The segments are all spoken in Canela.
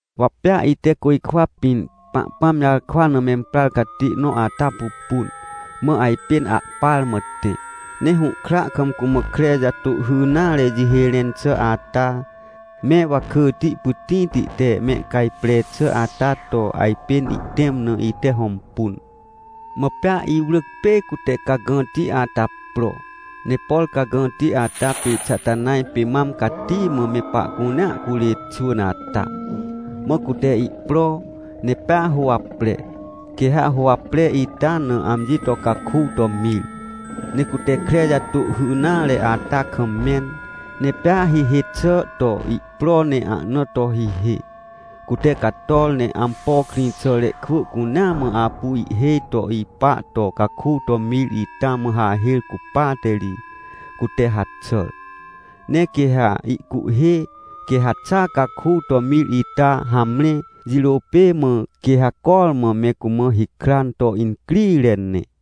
Wa pea ite côjkwa pĩn Pahpãm jarkwa na memprar catê nõ ata pupun, mã ajpên ahpar mã tẽ. Ne hũhkra kam cumã kre jatôhhy nare jihê rẽn xà ata, me wakỳti pytĩti te mehcajpre xà ata to ajpên ihtẽm na, ite hõmpun. Mã pea iwrỳc, pê cute cagãti ata pro, ne por cagãti ata pê Xatanaj pê mam cati mã me pahcunea curê xwỳn ata. Mã cute ihpro, ne pea huwapre, quê ha huwapre ita na amji to caku to mir. Ne cute kre jatôhhy nare ata kam mẽn. Ne pea hihê xà to ihpro ne ahna to hihê. Cute cator ne ampo krĩxàre kwỳ cunea mã apu ihhêj to ipa to caku to mir ita mã hahêr cupate ri, cute haxàr. Ne quê ha ihcuhhê, quê haxa caku to mir ita hamre, jirô pê mã, quê ha cormã me cumã hikran to incrire ne.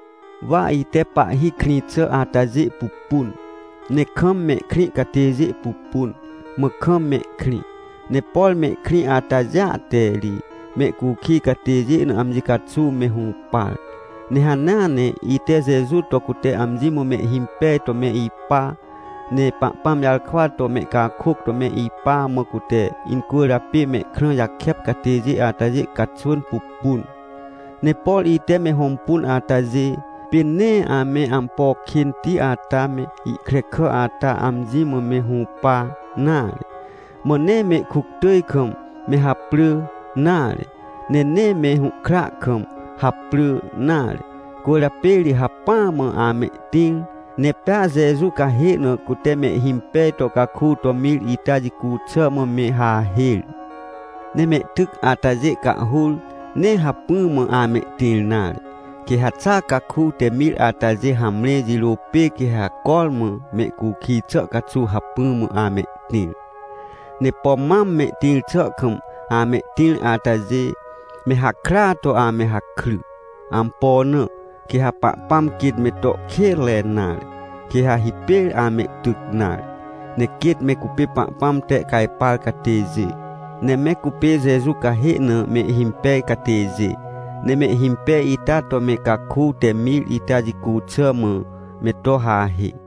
Wa ite pahhi krĩ xà atajê pupun, ne kam mehkrĩ catêjê pupun, mã kam mehkrĩ. Ne por mehkrĩ atajêa te ri mehcukij catêjê na amji caxuw me hũpar. Ne hanea ne ite Jeju to cute amji mã mehhimpej to me ipa, ne Pahpãm jarkwa to mehcakôc to me ipa, mã cute incwỳrjapê mehkrã jakep catêjê atajê caxwỳn pupun. Ne por ite me hõmpun atajê, pê nee ame ampo kênti ata me ihkrekà ata amji mã me hũpa nare, mã nee mehkuctỳj kam me haprỳ nare, ne nee me hũhkra kam haprỳ nare. Cwỳrjapê ri hacpỹa mã amehtĩr, ne pea Jeju cahê na cute mehhimpej to caku to mir ita jicu xà mã me hahêr. Ne mehtyc atajê cahhur, nee hacpỹ mã amehtĩr nare, quê ha xa caku te mir atajê hamre, jirô pê quê ha cormã mehcukij xà caxuw hacpỹ mã amehtĩr. Ne pom mam mehtĩr xà kam amehtĩr atajê, me hakrya to ame hakry. Ampo na? Quê ha Pahpãm quêt me to kênre nare, quê ha hipêr amehtyc nare. Ne quêt me cupê Pahpãm tehcajpar catêjê, ne me cupê Jeju cahê na mehhimpej catêjê, ne mehhimpej ita to me caku te mir ita jicu xà mã me to hahê.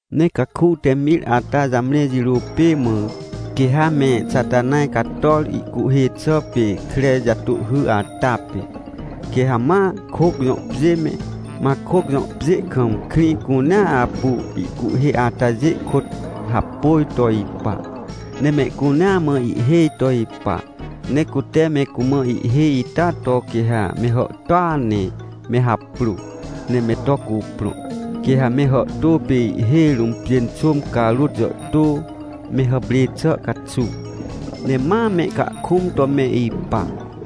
Ne caku te mir ata jamre jirô pê mã, quê ha me Xatanaj cator, ihcuhhê xà pê kre jatôhhy ata pê. Quê ha ma Coc jõ pjê me, Macoc jõ pjê kam, krĩ cunea apu ihcuhhê atajê kôt hapôj to ipa, ne mehcunea mã ihhêj to ipa. Ne cute me cumã ihhêj ita to quê ha me hàhtôa ne me haprô, ne me to cuprõ. Quê ha me hàhtô pê ihhêj rũm pjênxôm carôt jàhtô, me hàprê xà caxuw. Ne ma mehcahkũm to me ipa.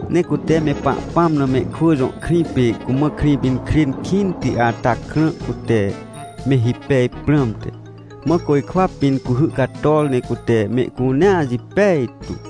Ne cute me Pahpãm na mehkwỳ jõ krĩ pê cumã Krĩpinkrên kĩnti ata krã, cute me hipej prãmte. Mã côjkwa pĩn cuhy cator, ne cute mehcunea jipej tu.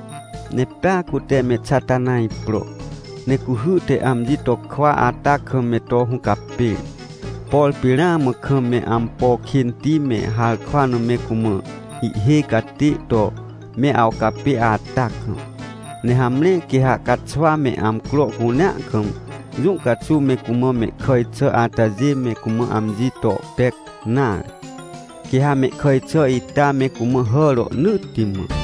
Ne pea cute me Xatanaj pro, ne cuhy te amji to kwa ata kam me to hũcapêr, por pê ramã kam me ampo kênti me harkwa na me cumã ihhêj catê to me awcapê ata kam. Ne hamre, quê ha caxwa me amcro cunea kam, jũ caxuw me cumã mehkàj xà atajê me cumã amji to pec nare, quê ha mehkàj xà ita me cumã hà rohnỳtti mã.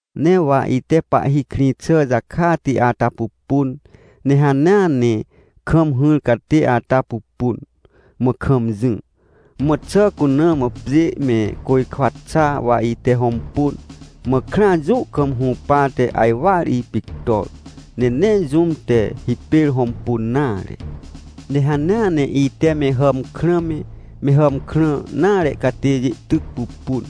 Ne wa ite Pahhi krĩ xà jakati ata pupun, ne hanea ne kam hỹr catê ata pupun, mã kam jỹ. Mã xà cuna mã pjê me côjkwa xa, wa ite hõmpun, mã krãa, jũ kam hũpate ajwar ipictor. Ne nee jũm te hipêr hõmpun nare. Ne hanea ne ite me hàmkrã me, me hàmkrã nare catêjê tyc pupun.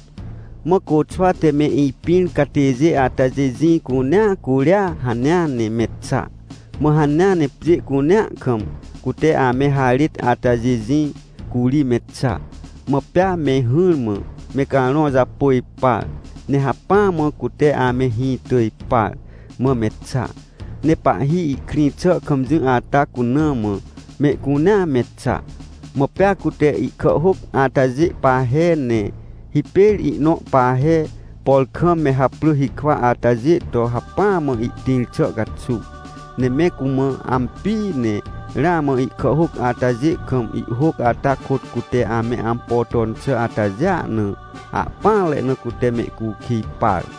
Mã côxwa te me ipĩr catêjê atajê jĩ cunea curia hanea ne me xa. Mã hanea ne pjê cunea kam cute ame harêt atajê jĩ, curi me xa. Mã pea me hỹrmã me carõ japôj par, ne hacpỹa mã cute ame hĩ tỳj par, mã me xa. Ne Pahhi ihkrĩ xà kam jỹ ata cuna mã mehcunea me xa. Mã pea cute ihkàhhôc atajê pahe, ne hipêr ihnõ pahe, por kam me haprỳ hikwa atajê to hacpỹa mã ihtĩr xà caxuw. Ne me cumã ampii, ne ramã ihkàhhôc atajê kam ihhôc ata kôt cute ame ampo ton xà atajêa na, ahpỹanre na cute mehcukij par.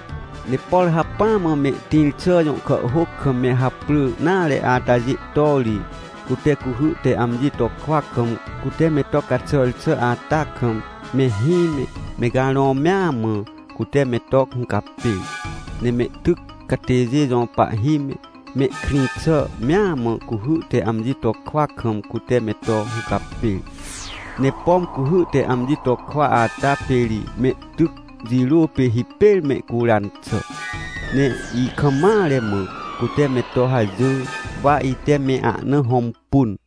Ne por hacpỹa mã mehtĩr xà jõ kàhhôc kam me haprỳ nare atajê to ri, cute cuhy te amji to kwa kam, cute me to caxàr xà ata kam, mehĩ me, me carõ me amã, cute me to hũcapêr. Ne mehtyc catêjê jõ pahhi me, mehkrĩ xà mea mã cuhy te amji to kwa kam, cute me to hũcapêr. Ne pom cuhy te amji to kwa ata pê ri mehtyc jirô pê hipêr mehcuran xà. Ne ikam mare mã cute me to hajỹr, wa ite me ahna hõmpun.